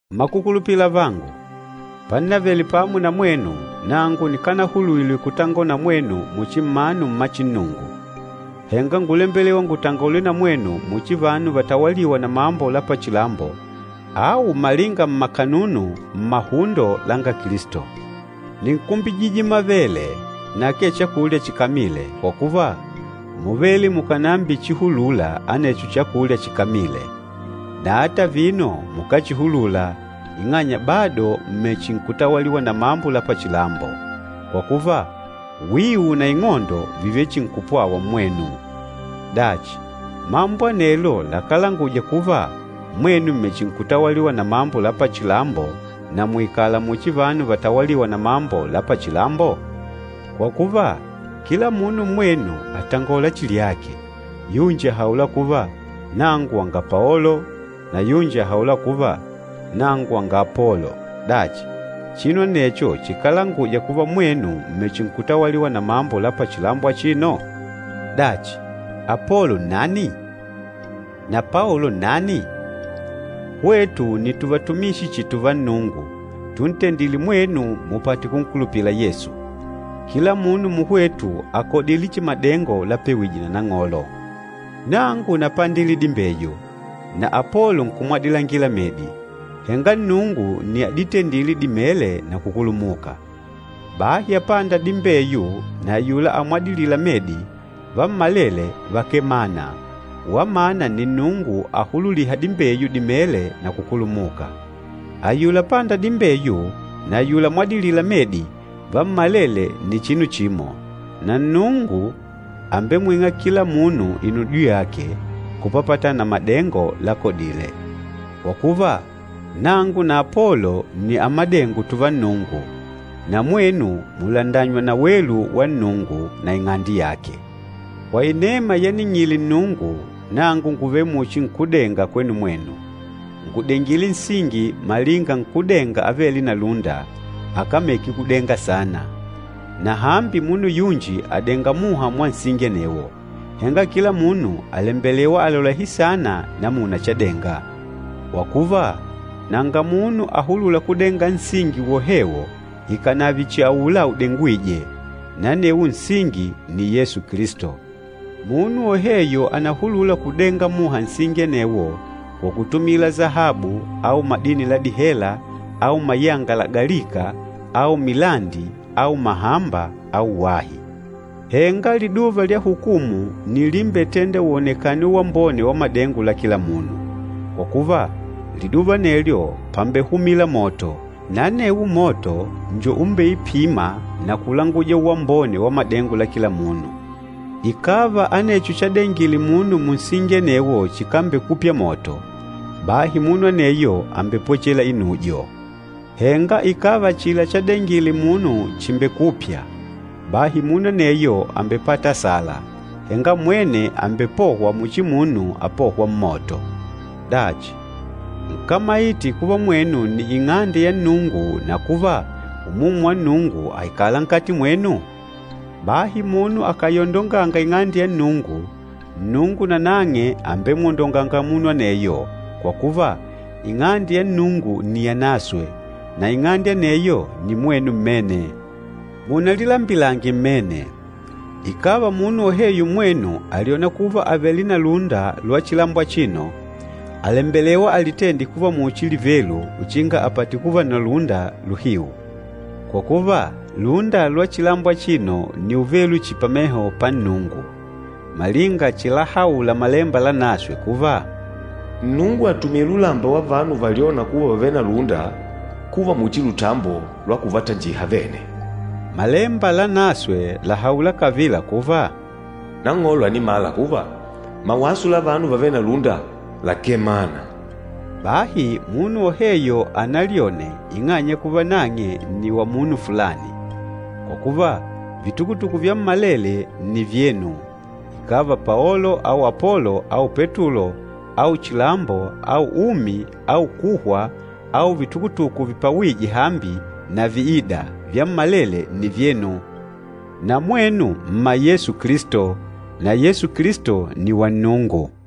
Mmakukulupila avangu, pannavele pamo na mwenu, nangu nikanahulwile kutangola na mwenu muchi mmanu mma chinnungu. Henga ngúlembelewa ngutangole na mwenu muchi vanu vatawalîwa na mambo la pachilambo au malinga mmakanunu mmahundo langa Kilisto. Nínkumbijije mavele, na akee chakulya chikamile, kwa kuva, múvele mukànambichihulula anecho chakulya chikamile. Na ata vino mukáchihulula, ing'anya bado m̀mechinkutawaliwa na mambo la pachilambo. Kwa kuva, wiu na ing'ondo vìvele chihi nkupwawa mmwenu. Dachi, mambo anelo lakálanguja kuva mwenu m̀mechinkutawaliwa na mambo la pachilambo, na muikalanga muchi vanu vatawalîwa na mambo la pachilambo? Kwa kuva, kila munu mmwenu àtangola chihi lyake, yunji àhaula kuva, “Nangu wanga Paolo,” na yunji àhaula kuva, “Nangu wanga Apolo.” Dachi, chinu anecho chikálanguja kuva mwenu m̀mechinkutawaliwa na mambo la pachilambo achino? Dachi, Apolo nnani? Na Paolo nnani? Hwetu nni tuvatumishi chihi tuva Nnungu, tuntendîle mwenu mupate kunkulupila Yesu. Kila munu muhwetu àkodile chihi madengo lapewije na Nang'olo. Nangu napandile dimbeyu, na Apolo nkumwadilangila medi, henga Nnungu nni aditendîle dimele na kukulumuka. Bahi apânda dimbeyu na ayula amwadilîla medi, vammalele vakávele mana, wamana nni Nnungu ahululîha dimbeyu dimele na kukulumuka. Ayula apânda dimbeyu na ayula amwadilîla medi vammalele nni chinu chimo, na Nnungu àmbemwing'a kila munu inudyo yake kupapatana na madengo lakodile. Kwa kuva, nangu na Apolo nni amadengo tùvá Nnungu, na mwenu mùlandanywa na welu wa Nnungu na ing'ande yake. Kwa inema yaning'ile Nnungu, nangu ngùvele muchi nkúdenga kwenu mwenu. Ngùdengile nsingi malinga nkúdenga avêle na lúnda, akameke kudenga saana. Na hambi munu yunji àdenga muha mwa nsingi anewo, henga kila munu àlembelewa alolehe saana namuna chadenga. Kwa kuva, nanga munu ahulûla kudenga nsingi wohewo ikànave chihi aula udengwîje, na anewo nsingi nni Yesu Kilisto. Munu woheyo ànahulula kudenga muha nsingi anewo kwa kutumila sahabu au madini la dihela au mayanga lagalika au milandi au mahamba au wahi. Henga liduva lya hukumu nni limbetênda uwonekane uwambone wa madengo la kila munu. Kwa kuva, liduva anelyo pambehumila moto, na anewo moto njo umbeipîma na kulanguja uwambone wa madengo la kila munu. Ikàva anecho chadengile munu munsingi anewo chikambekupya moto, bahi munu aneyo àmbepwechela inujo. Henga ikàva achila chadengile munu chìmbekupya, bahi munu aneyo àmbepata asala, henga mwene àmbepohwa muchi munu apôhwa mmoto. Dachi, nkámaite kuva mwenu nni Ing'ande ya Nnungu, na kuva Umumu wa Nnungu àikala nkati mwenu? Bahi munu akàyondonganga Ing'ande ya Nnungu, Nnungu nanang'e àmbemwondonganga munu aneyo, kwa kuva, Ing'ande ya Nnungu nni yanaswe, na ing'ande aneyo nni mwenu mmene. Munalilambilange mmene, ikàva munu woheyo mmwenu àlyona kuva àvele na lúnda lwa chilambo achino, àlembelewa alitende kuva muchi livelu uchinga apate kuva na lúnda luhiu. Kwa kuva, lúnda lwa chilambo achino nni uvelu chihi pameho pa Nnungu. Malinga chilahaula Malemba Lanaswe kuva, “Nnungu àtumila ulamba wa vanu valyôna kuva vàvele na lúnda kuva muchi lutambo lwa kuvatanjiha vene.” Malemba Lanaswe làhaula kavila kuva, “Nang'olo ànimala kuva, mawaso la vanu vavêle na lúnda, lakemana.” Bahi munu woheyo analyone ing'anya ya kuva nang'e nni wa munu fulani! Kwa kuva, vitukutuku vyammalele nni vyenu, ikàva Paolo au Apolo au Petulo au chilambo au umi au kuhwa au vitukutuku vipawîje hambi na viîda, vyammalele nni vyenu. Na mwenu mma Yesu Kilisto, na Yesu Kilisto nni wa Nnungu.